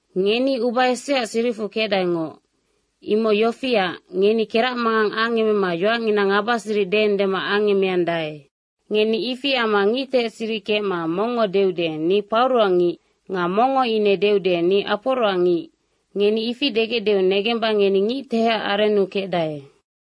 Ngeni uba eseaac siricfu kecdaengoc. Imoc yofiac, ngeni keracmangang angemema yoacngina ngabasiric deendema angemeandae. Ngeni ifi amma ngictehec siric kecma mongngo deude, “Ni Pauroac ngic.” Nga mongngo ine deude, “Ni Aporoac ngic.” Ngeni ifi degecdeu negemba ngeni ngictehecac arennu kecdae.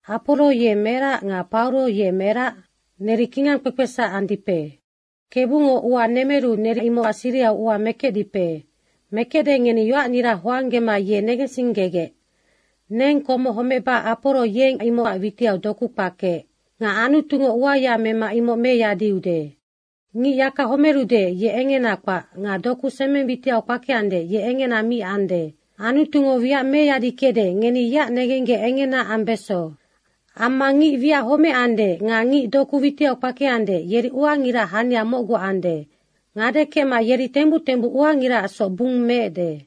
Aporo ye merac nga Pauro ye merac? Neri kingangkpekpesac andipe. Kebungo ua nemeru neri imocac sirihau ua mekecdipe. Mekecde ngeni yoacnira hoanggema ye negensinggegec. Neng komoc homecba Aporo yeng imocac witiau doku kpakeec. Nga Anutungo uaya mema imoc meyadiude. Ngic yaka homerude, ye engena kpac nga doku semeng witiau kpakeande, ye engena mi ande. Anutungo wiac meyadikecde, ngeni yeac negenggec engena ambeso. Amma ngic wiac homecande nga ngic doku witiau kpakeande, yeri uangiraac hania mocgu ande. Ngade kecma yeri tembuc tembuc uangiraacsoc bung meecde.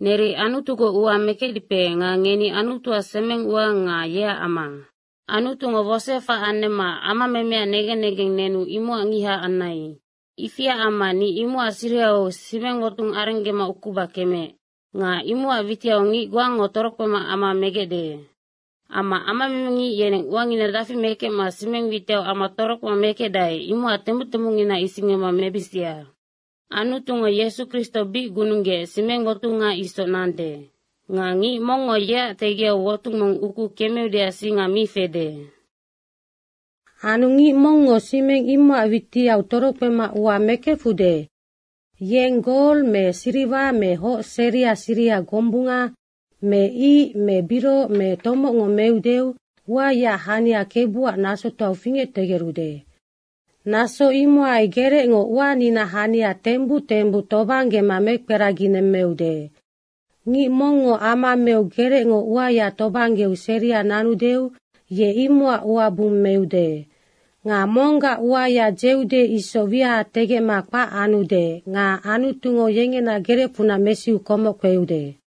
Neri Anutugoc ua mekecdipe nga ngeni Anutuac semengua nga yeac ama. Anutungo wosoefac anemma amamemeac negen negeng nenu imocac ngiha anai. Ifiac amma ni imocac sirihau simengwotung arenggema ukuba kemeec. Nga imocac witiau ngic goango torokpema ama megecde. Amma amamemengic yeneng uangina dafi mekecma simeng witiau ama torokpema mekecdae, imoc tembuc tembucngina isinggema mebisia. Anutungo Yesu Kristo bic gununggeec simengwotunga isoc nande. Nga ngic mongngo yeac tegiau wotung mong ukuu kemeudeac singa mi fede. Anu ngic mongngo simeng imocac witiau torokpema ua mekefude, yeng gol me siriwa me hoc seria siriha gombunga me ic me birohoc me tomocngo meudeu uayaac hania Kebuac nasotoau fingectegerude. Naso imohai gerecngo uaninaac hania tembuc tembuc tobanggema mekperaginemmeude. Ngic mongngo ama meu gerecngo uaya tobanggeu seria nanudeu ye imocac ua bung meude. Nga monggac uaya dzeude isoc wiaha tegecma kpac anude nga Anutungo yengena gerecfunac mesiu komoc kpeude.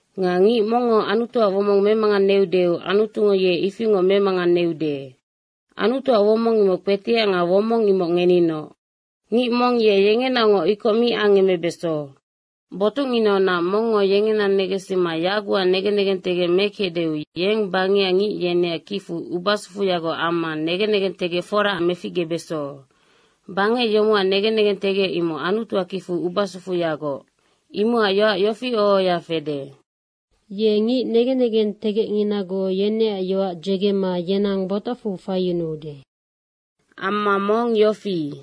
Nga ngic mongngo Anutuac womong memanganeudeu Anutungo ye ifingoc memanganeude. Anutuac womong imoc kpetiac nga womong imoc ngeninoc. Ngic mong yengenaocngoc ikoc mi angemebeso. Botucnginaunac mongngo yengena negensima yagucac negen negentegec mekecdeu yeng bangecac ngic yeneac kicfu ubasufuyagoc amma negen negentegec fora meficgebeso. Bangec yomocac negen negentegec imoc Anutuac kicfu ubasufuyagoc. Imocac yoac yofi oho ohoya fede, “Ye ngic negen negentegecnginagoc yeneac yoac dzegema yenang botacfu faiyunuude.” Amma mong yofi,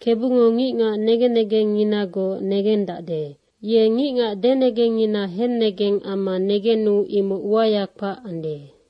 “KEBUNGO ngicngac negen negengnginagoc negendacde. Ye ngicngac denegengngina hennegeng amma negenu imoc uaya kpac ande.”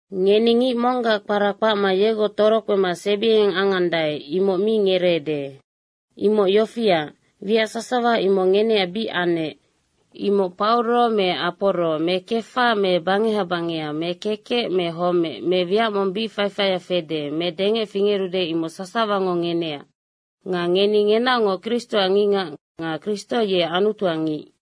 Ngeni ngic monggac kpara kpacma yegoc torokpema sebiengeng angandae, imoc mi ngereede. Imoc yofiac, wiac sasawa imoc ngeneac bic anec. Imoc Pauro me Aporo me Kefa me bangeha bangeha me kekec me homec me wiac mong bic faifaia fede me dengec fingerude, imoc sasawango ngeneac. Nga ngeni ngenaocngoc Kristoac ngicngac nga Kristo ye Anutuac ngic.